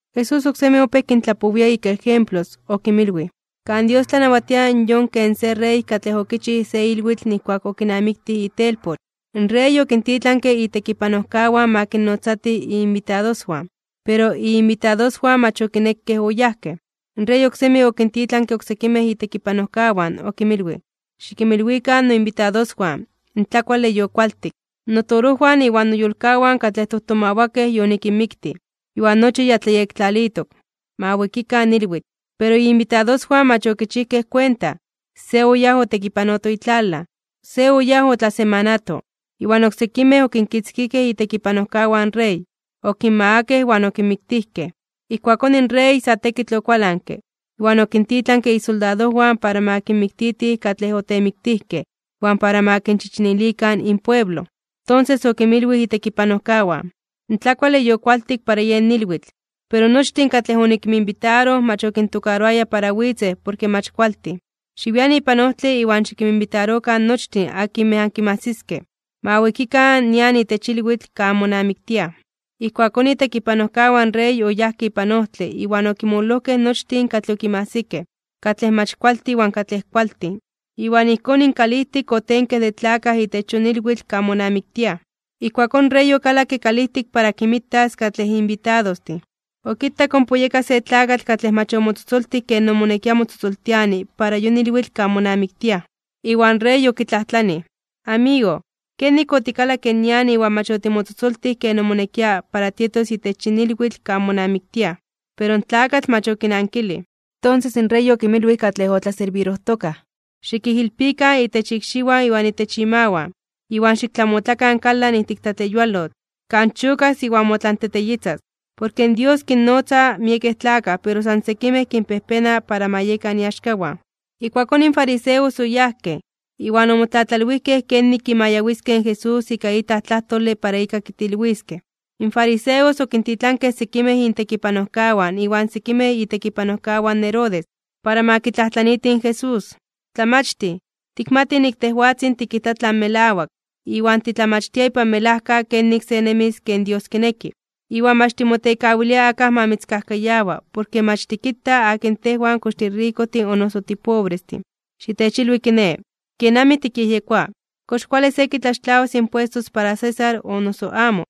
Jesús oksemi opéj kintlapowia ika ejemplos, okinmilwij: ―Kan Dios tlanawatia yon ken se rey katlej okichij se ilwitl nijkuak okinamiktij itelpoch. In rey okintitlanke itekipanojkawan ma kinnotzatij iinbitadoswan, pero iinbitadoswan mach okinekej oyajkej. In rey oksemi okintitlanke oksekimej itekipanojkawan, okinmilwij: “Xikinmilwikan noinbitadoswan, in tlakuale yokualtik. Notorojwan iwan noyolkawan katlej tojtomawakej yonikinmiktij, iwan nochi ya tlayektlalitok. Ma wikikan ilwitl.” Pero iinbitadoswan mach okichijkej kuenta. Se oyáj otekipanoto itlalaj, se oyáj otlasemanato, iwan oksekimej okinkitzkijkej itekipanojkawan in rey, okinmagakej iwan okinmiktijkej. Ijkuakón in rey sa tekitl okualanke, iwan okintitlanke isoldadojwan para ma kinmiktitij katlej otemiktijkej iwan para ma kinchichinilikan inpueblo. Tonses okinmilwij itekipanojkawan: “In tlakuale yokualtik para yen ilwitl, pero nochtin katlej onikinminbitaroj mach okintokaroaya para witzej porke mach kualtin. Xiwian ipan ojtle iwan xikinminbitarokan nochtin akinmej ankinmajsiskej, ma wikikan nian itech ilwitl kan monamiktiaj.” Ijkuakón itekipanojkawan in rey oyajkej ipan ojtle iwan okinmololojkej nochtin katlej okinmajsikej, katlej mach kualtin iwan katlej kualtin. Iwan ijkón in kalijtik otenke de tlakaj itech yon ilwitl kan monamiktiaj. ’Ijkuakón in rey okalakke kalijtik para kinmitas katlej inbitadostin, okitak ompa oyeka se tlakatl katlej mach omotzotzoltij ken omonekia motzotzoltiani para yon ilwitl kan monamiktiaj. Iwan rey okitlajtlanij: “Amigo, ¿kenik otikalakke nian iwan mach otimotzotzoltij ken moneki para tietos itech yin ilwitl kan monamiktiaj?” Pero in tlakatl mach okinankilij. Tonses in rey okinmilwij katlej otlaserbirojtokaj: “Xikijilpikan itech ikxiwan iwan itech imawan, iwan xiktlamotlakan kalan ijtik tlatleyualotl, kan chokas iwan motlanteteyitzas.” ’Porke Dios kinnotza miekej tlakaj pero san sekimej kinpejpena para ma yekan iaxkawan. Ijkuakón in fariseos oyajkej, iwan omotlatlalwijkej kenik kimayawiskej in Jesús ika itlaj tlajtole para ika kitilwiskej. In fariseos okintitlankej sekimej intekipanojkawan iwan sekimej itekipanojkawan in Herodes, para ma kitlajtlaniitij in Jesús: ―Tlamachtij, tikmatij nik tejwatzin tikijta tlan melawak, iwan titlamachtia ipan melajka kenik se nemis ken Dios kineki, iwan mach timotekawilia akaj ma mitzkajkayawa, porke mach tikita akin tejwan kox tirikojtin o noso tipobrestin. Xitechilwi kiné, kenamij tikyejyekoa: ¿Kox kuale se kitlaxtlawas impuestos para César o noso amo?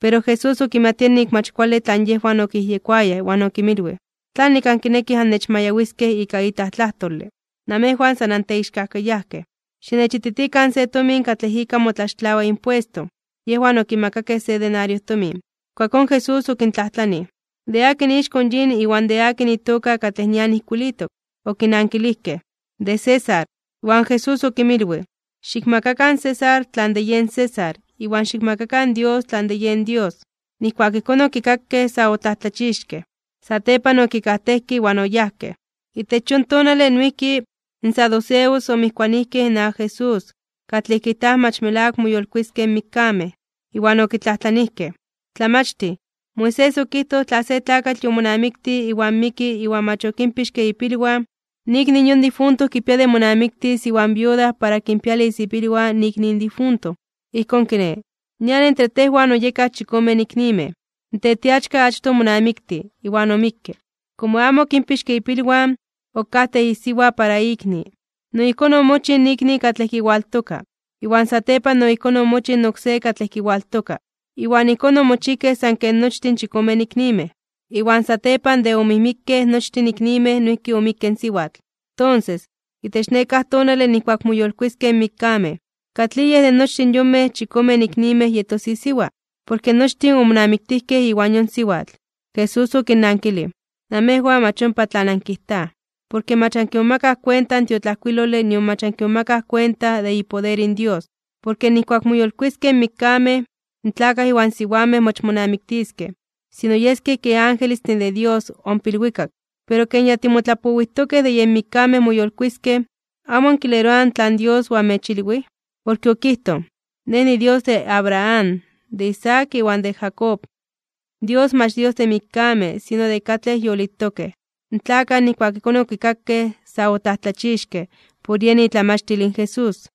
Pero Jesús okimatia nik mach kuale tlan yejwan okiyejyekoayaj, iwan okinmilwij: ―¿Tlanik ankinekij annechmayawiskej ika itlaj tlajtole? Namejwan san anteixkajkayajkej. Xinechititikan se tomin katlej ika motlaxtlawa impuesto. Yejwan okimakakej se denario tomin. Ijkuakón Jesús okintlajtlanij: ―¿De akin ixko in yin iwan de akin itoka katlej nian ijkuilitok? Okinankilijkej: ―De César. Iwan Jesús okinmilwij: ―Xikmakakan in César tlan de yen César, iwan xikmakakan Dios tlan de yen Dios. Nijkuak ijkón okikakej, sa otlajtlachixkej (omomajmawtijkej). Satepan okikajtejkej iwan oyajkej. Itech yon tonale noijki, in saduceos omijkuanijkej inawak Jesús, katlej kijtaj mach melawak moyolkuiskej (moyolitiskej) in mikkamej. Iwan okitlajtlanijkej: ―Tlamachtij, Moisés okijtoj tla se tlakatl yomonamiktij iwan miki iwan mach okinpixke ipilwan, in ikni in yon difunto kipia de monamiktis iwan viuda para kinpialis ipilwan in ikni in difunto. Ijkón kiné, nian entre tejwan oyekaj chikomen iknimej. In tetiachka achtoj omonamiktij, iwan omikke. Komo amo okinpixke ipilwan, okajtej isiwa para ikni. No ijkón omochij ikni katlej kiwaltoka, iwan satepan no ijkón omochij in oksé katlej kiwaltoka, iwan ijkón omochijkej san ken nochtin chikomen iknimej. Iwan satepan de omijmikkej nochtin iknimej noijki omikke in siwatl. Tonses, itech nekáj tonale nijkuak moyolkuiskej (moyolitiskej) in mikkamej, ¿katlij yej de nochtin yonmej chikomen iknimej yetos isiwa? Porke nochtin omonamiktijkej iwan yon siwatl. Jesús okinnankilij: ―Namejwan mach ompa tlan ankijtaj, porke mach ankimomakaj kuenta in tiotlajkuilole nion mach ankimomakaj kuenta de ipoder in Dios. Porke nijkuak moyolkuiskej (moyolitiskej) in mikkamej, in tlakaj iwan siwamej mach monamiktiskej, sino yeskej kej angelestin de Dios ompa ilwikak. Pero ken ya timotlapowijtokej de yen mikkamej moyolkuiskej, ¿amo ankileroaj tlan Dios oamechilwij? Porke okijtoj: “Nej niDios de Abraham, de Isaac iwan de Jacob.” In Dios mach Dios de mikkamej, sino de katlej yolitokej. In tlakaj nijkuak ijkón okikakej, sa otlajtlachixkej (omomajmawtijkej) por yen itlamachtil in Jesús.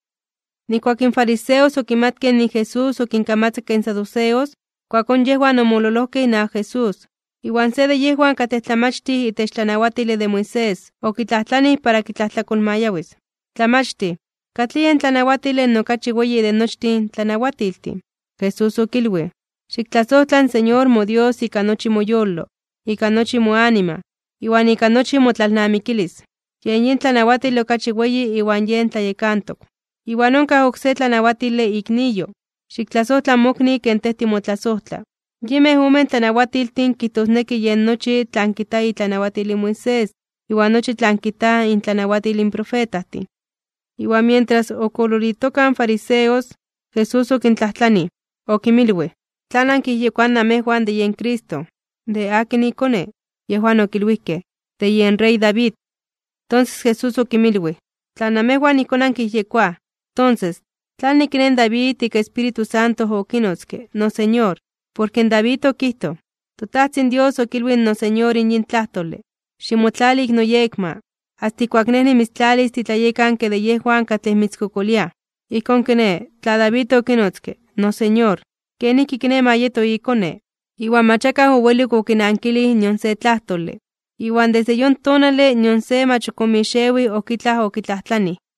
Nijkuak in fariseos okimatkej nik in Jesús okinkamatzakke in saduceos, ijkuakón yejwan omololojkej inawak Jesús. Iwan se de yejwan katlej tlamachtij itech tlanawatile de Moisés, okitlajtlanij para kitlajtlakolmayawis: ―Tlamachtij, ¿katlij yen tlanawatile okachi weyi de nochtin in tlanawatiltin? Jesús okilwij: ―“Xiktlasojtla in Señor moDios ika nochi moyolo, ika nochi moanima, iwan ika nochi motlalnamikilis.” Yen yin tlanawatile okachi weyi iwan yen tlayekantok. Iwan onkaj oksé tlanawatile, ikniyo: “Xiktlasojtla mokni ken tej timotlasojtla.” Yinmej omen tlanawatiltin kijtosneki yen nochi tlan kijta itlanawatil in Moisés iwan nochi tlan kijta intlamachtil in profetajtin. Iwan mientras ok oololitokaj in fariseos, Jesús okintlajtlanij, okinmilwij: ―¿Tlan ankiyejyekoaj namejwan de yen Cristo? ¿De akin iKone? Yejwan okilwijkej: ―De yen rey David. Tonses Jesús okinmilwij: ―Tla namejwan ijkón ankiyejyekoaj, tonses, ¿tlanik kiné in David ika Espíritu Santo okinotzke “noSeñor”? Porke David okijtoj: In toTajtzin Dios okilwij in noSeñor yin tlajtole: “Ximotlali ik noyekma, asta ijkuak Nej nimitztlalis titlayekanke de yejwan katlej mitzkokoliaj.” Ijkón kiné, tla David okinotzke “noSeñor”, ¿kenijki kiné ma yeto ikone? Iwan mach akaj owelik okinankilij nion se tlajtole, iwan desde yon tonale nion se mach ok omixewij ok itlaj okitlajtlanij.